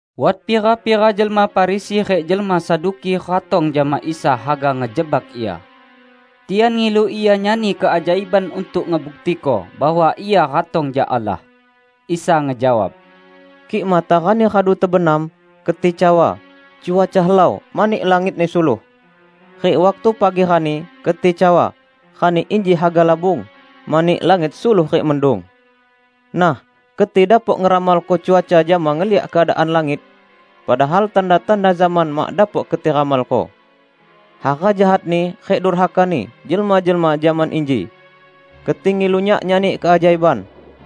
Wat pira-pira jelma Farisi rik jelma Saduki ratong jama Isa haga ngejebak Ia. Tian ngilu Ia nyani keajaiban untuk ngebuktiko bahwa Ia ratong jak Allah. Isa ngejawab, ["Kik matarani radu tebenam, keti cawa, 'Cuaca helau, mani langitni suluh.' Rik waktu pagi rani, keti cawa, 'Rani inji haga labung, mani langit suluh rik mendung.' Nah, keti dapok ngeramalko cuaca jama ngeliak keadaan langit, padahal tanda-tanda zaman mak dapok keti ramalko!"] "Hara jahatni rik durhakani jelma-jelma zaman inji. Keti ngilu Nyak nyani keajaiban.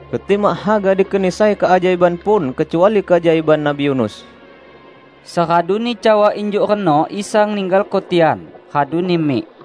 Keti mak haga dikeni sai keajaiban pun kecuali keajaiban Nabi Yunus." Seraduni cawa injuk reno Isa ninggalko tian, raduni mik.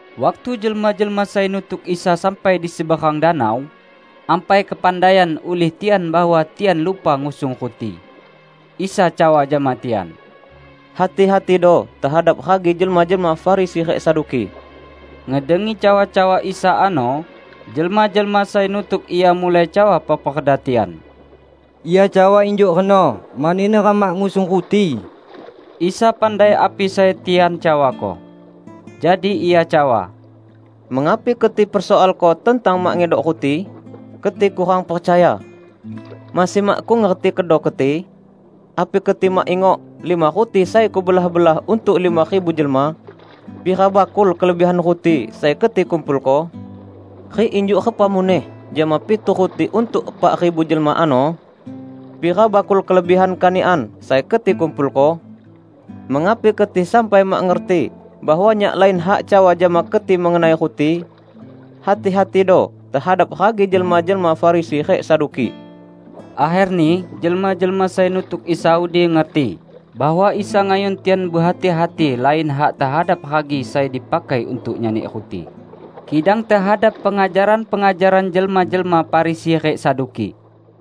Waktu jelma-jelma sai nutuk Isa sampai di seberang danau, ampai kepandaian ulih tian bahwa tian lupa ngusung ruti. Isa cawa jama tian, "Hati-hatido tehadap ragi jelma-jelma Farisi rik Saduki." Ngedengi cawa-cawa Isa ano, jelma-jelma sai nutuk Ia mulai cawa peperda tian, "Ia cawa injuk reno mani neram mak ngusung ruti." Isa pandai api sai tian cawako. Jadi Ia cawa, "Mengapi keti persoalko tentang mak ngedok ruti? Keti kurang percaya! Masih makkung ngerti kedo keti? Api keti mak ingok lima ruti sai Kubelah-belah untuk lima ribu jelma? Pira bakul kelebihan ruti sai keti kumpulko? Rik injuk repa muneh jama pitu ruti untuk epak ribu jelma ano? Pira bakul kelebihan kanikan sai keti kumpulko? Mengapi keti sampai mak ngerti bahwa Nyak lain hak cawa jama keti mengenai ruti? Hati-hatido tehadap ragi jelma-jelma Farisi rik Saduki!" Akherni jelma-jelma sai nutuk Isa udi ngerti bahwa Isa ngayun tian behati-hati lain hak tehadap ragi sai dipakai untuk nyani ruti, kidang tehadap pengajaran-pengajaran jelma-jelma Farisi rik Saduki.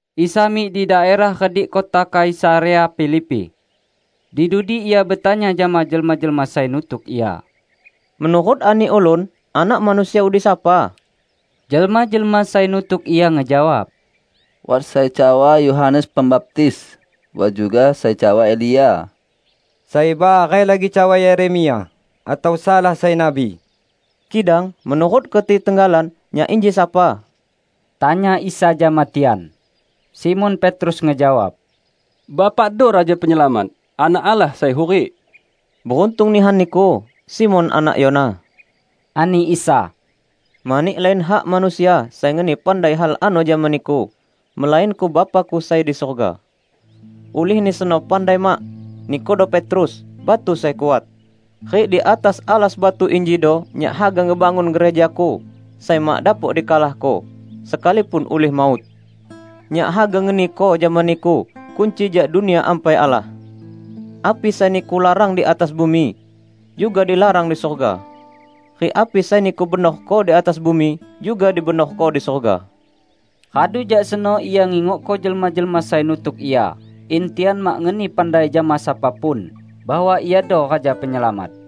Isa mik di daerah redik kota Kaisarea Filipi. Di dudi Ia betanya jama jelma-jelma sai nutuk Ia, "Menurut ani ulun, Anak Manusia udi sapa?" Jelma-jelma sai nutuk Ia ngejawab, "Wat sai cawa Yohanes Pembaptis. Wat juga sai cawa Elia. Sai bareh lagi cawa Yeremia, atau salah sai nabi." "Kidang menurut keti tenggalan, Nyak inji sapa?" tanya Isa jama tian. Simon Petrus ngejawab, "Bapakdo Raja Penyelamat, Anak Allah Sai Hurik." "Beruntung nihan niku, Simon anak Yona!" ani Isa. "Mani lain hak manusia sai ngeni pandai hal ano jama niku, melainko Bapa-Ku sai di surga. Ulihni seno pandai mak, nikudo Petrus, batu sai kuat. Rik di atas alas batu injido Nyak haga ngebangun gereja-Ku, sai mak dapok dikalahko; sekalipun ulih maut! Nyak haga ngeniko jama niku kunci jak Dunia Ampai Allah. Api sai niku larang di atas bumi, juga dilarang di surga. Rik api sai niku benorko di atas bumi, juga dibenorko di surga." Radu jak seno Isa ngingokko jelma-jelma sai nutuk Ia in tian mak ngeni pandai jama sapa pun bahwa Iado Raja Penyelamat.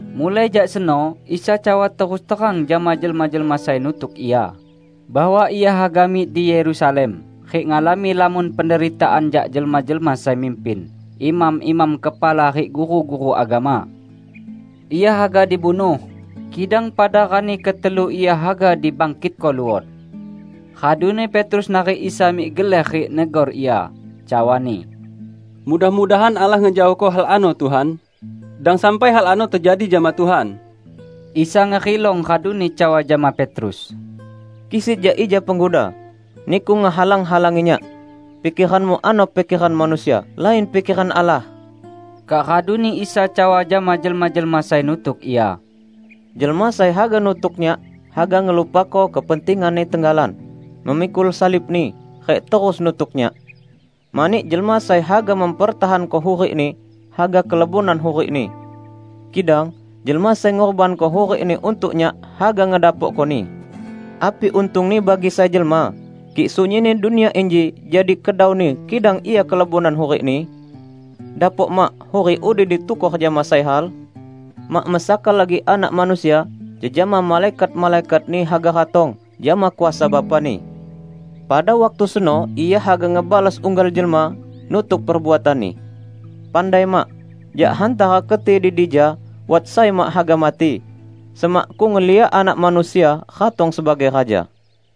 Mulai jak seno, Isa cawa terus terang jama jelma-jelma sai nutuk Ia, bahwa Ia haga mik di Yerusalem rik ngalami lamon penderitaan jak jelma-jelma sai mimpin, imam-imam kepala rik guru-guru agama. Ia haga dibunuh, kidang pada rani ketelu Ia haga dibangkitko luot. Raduni Petrus narik Isa mik geler rik negor Ia, cawani, "Mudah-mudahan Allah ngejaohko hal ano, Tuhan! Dang sampai hal ano tejadi jama Tuhan!" Isa ngerilong raduni cawa jama Petrus, "Kisit jak ija, Pengguda! Niku ngehalang-halangi Nyak. Pikeranmu ano pikeran manusia; lain pikeran Allah!" Kak raduni Isa cawa jama jelma-jelma sai nutuk Ia, "Jelma sai haga nutuk Nyak, haga ngelupako kepentinganni tenggalan, memikul salibni, rik terus nutuk Nyak. Mani jelma sai haga mempertahanko hurikni, haga kelebonan hurikni. Kidang jelma sai ngurbanko hurikni untuk Nyak, haga ngedapokkoni. Api untungni bagi sai jelma, kik sunyinni dunia inji jadi kedauni kidang ia kelebonan hurikni? Dapok mak hurik udi ditukor jama sai hal? Mak mesaka lagi Anak Manusia, jejama malaikat-malaikat-Ni haga ratong jama kuasa Bapa-Ni. Pada waktu seno Ia haga ngebalos unggal jelma nutuk perbuatanni. Pandai mak! Jak hantara keti di dija wat sai mak haga mati, semakkung ngeliak Anak Manusia ratong sebagai Raja."